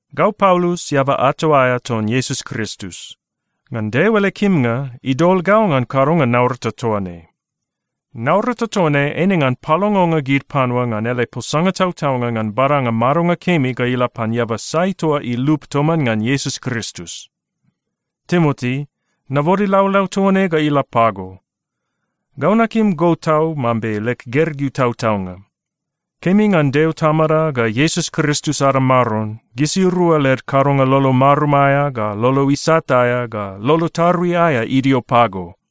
Gau Paulus, eaba ato aea ton Iesus Kristus. Ngan Deo ele kimnga, idol gau ngan kadonga naurata toa ne. Naurata toa ne eine ngan palongonga gid panua ngan ele posanga tautaunga ngan badanga madonga kemi ga ila pan eaba sai toa ilup toman ngan Iesus Kristus. Timoti, nabode laulau toa ne ga ila pago. Gau nakim go tau mambe leg gergeu tautaunga. Kemi ngan Deo Tamada ga Iesus Kristus ada Maron, gisirua led kadonga lolo marum aea, ga lolo isat aea, ga lolo tarui aea idio pago.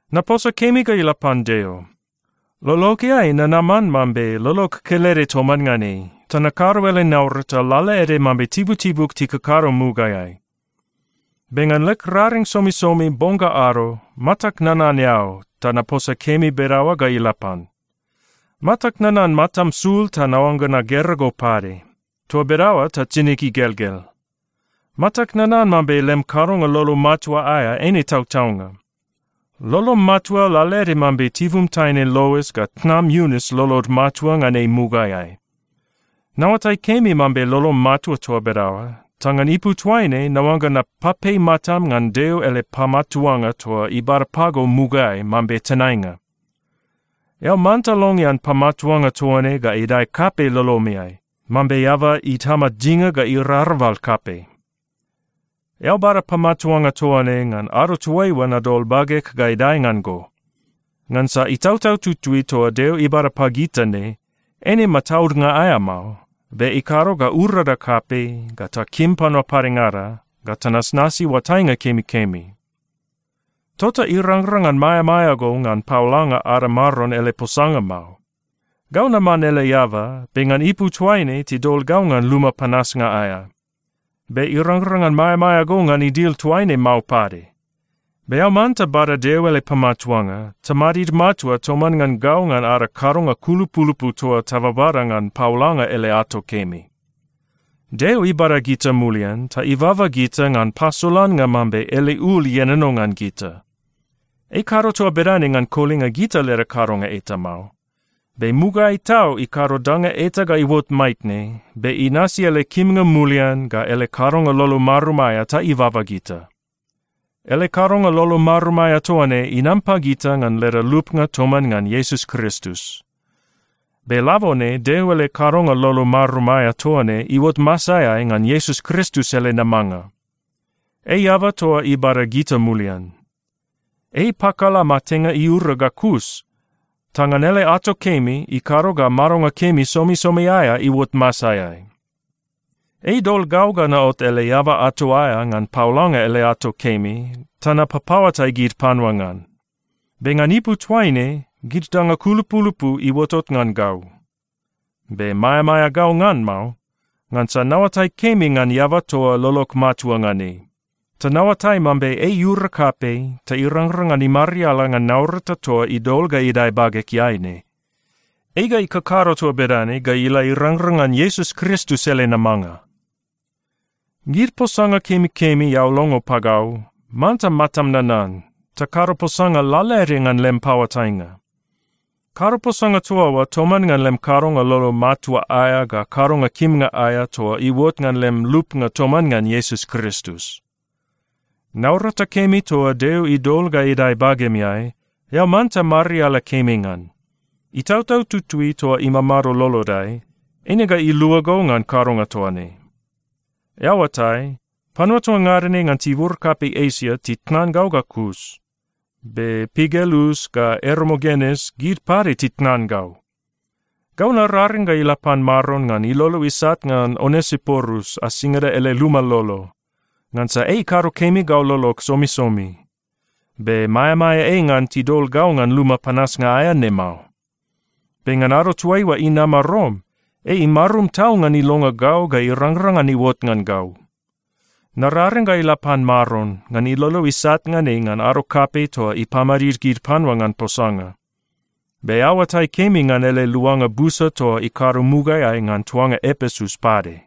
Naposa kemi ga ila pan Deo. Lologeai nanaman mambe lolog kelede toman ngan ei, ta nakado ele naurata lalaede mambe tibutibug tikakado mugaeai. Be ngan leg raring somisomi bong ga ado, matag nanan eao ta naposa kemi bedaoa ga ila pan. Matag nanan matam sul ta naoangga nagera go pade. Toa bedaoa ta tinig igelgel. Matag nanan mambe lem kadonga lolo matua aea eine tautaunga. Lolom matua lalaede mambe tibum taine Lois ga tnam Iunis lolod matua ngan ei mugaeai. Naoatai kemi mambe lolom matua toa bedaoa, ta ngan ipu toaine naoangga napapei matam ngan Deo ele pamatuanga toa ibada pago mugaeai mambe tenainga. Eao manta longean pamatuanga toa ne ga idae kapei lolomeai, mambe eaba itama dinga ga irarabal kapei. Eao bada pamatuanga toa ne ngan ado toaiua nadol bageg ga idae ngan go. Ngansa Itautau Tutui toa Deo ibada pagita ne, eine mataudnga aea mao, be ikado ga urada kapei, ga takim panua padengada, ga tanasnasi oatainga kemikemi. Tota irangrang ngan maeamaea go ngan paolanga ada Maron ele posanga mao. Gau naman ele eaba, be ngan ipu toaine tidol gau ngan luma panasnga aea. Be irangrang ngan maeamaea go ngan idil toaine mao pade. Be eao manta bada Deo ele pamatuanga ta madid matua toman ngan gau ngan ada kadonga kulupulupu toa tababada ngan paolanga ele ato kemi. Deo ibada gita mulian ta ibaba gita ngan pasolannga mambe ele ul ienono ngan gita. Ei ikado toa bedane ngan kolinga gita leda kadonga eta mao. Be mugaeai tau ikado danga eta ga iuot maitne, be inasi ele kimnga mulian ga ele kadonga lolo marum aea ta ibaba gita. Ele kadonga lolo marum aea toa ne inam pagita ngan leda lupnga toman ngan Iesus Kristus. Be labone Deo ele kadonga lolo marum aea toa ne iuot masaeai ngan Iesus Kristus ele namanga. Ei eaba toa ibada gita mulian. Ei ipakala matenga iura ga kus, ta ngan ele ato kemi, ikado ga madonga kemi somisomi aea iuot masaeai. Ei idol gau ga naot ele eaba ato aea ngan paolanga ele ato kemi ta napapaoatai gid panua ngan. Be ngan ipu toaine, gid danga kulupulupu iuotot ngan gau. Be maeamaea gau ngan mao, ngansa naoatai kemi ngan eaba toa lolog matua ngan ei. Ta naoatai mambe ei iura kapei ta irangrang ngan imariala ngan naurata toa idol ga idae bagegeai ne. Ei ga ikakado toa bedane ga ila irangrang ngan Iesus Kristus ele namanga. Gid posanga kemikemi eao longo pagau, manta matam nanan, ta kado posanga lalaede ngan lem paoatainga. Kado posanga toa oa toman ngan lem kadonga lolo matua aea ga kadonga kimnga aea toa iuot ngan lem lupnga toman ngan Iesus Kristus. Naurata kemi toa Deo idol ga idae bagemeai, eao manta mariala kemi ngan. Itautau Tutui toa imamado lolodai, eine ga ilua go ngan kadonga toa ne. Eao oatai, panua toa ngada ne ngan tibur kapei Esia titnan gau ga kus. Be Pigelus ga Ermogenes, gid pade titnan gau. Gau nararing ga ila pan Maron ngan ilolo isat ngan Onesiporus asingada ele luma lolo, ngansa ei ikado kemi gau lolog somisomi. Be maeamaea ei ngan tidol gau ngan luma panasnga aea ne mao. Be ngan ado toaiua inama Rom, ei imarum tau ngan ilonga gau ga irangrang ngan iuot ngan gau. Nararing ga ila pan Maron, ngan ilolo isat ngan ei ngan ado kapei toa ipamadid gid panua ngan posanga. Be eao oatai kemi ngan ele luanga busa toa ikado mugaeai ngan tuanga Epesus pade.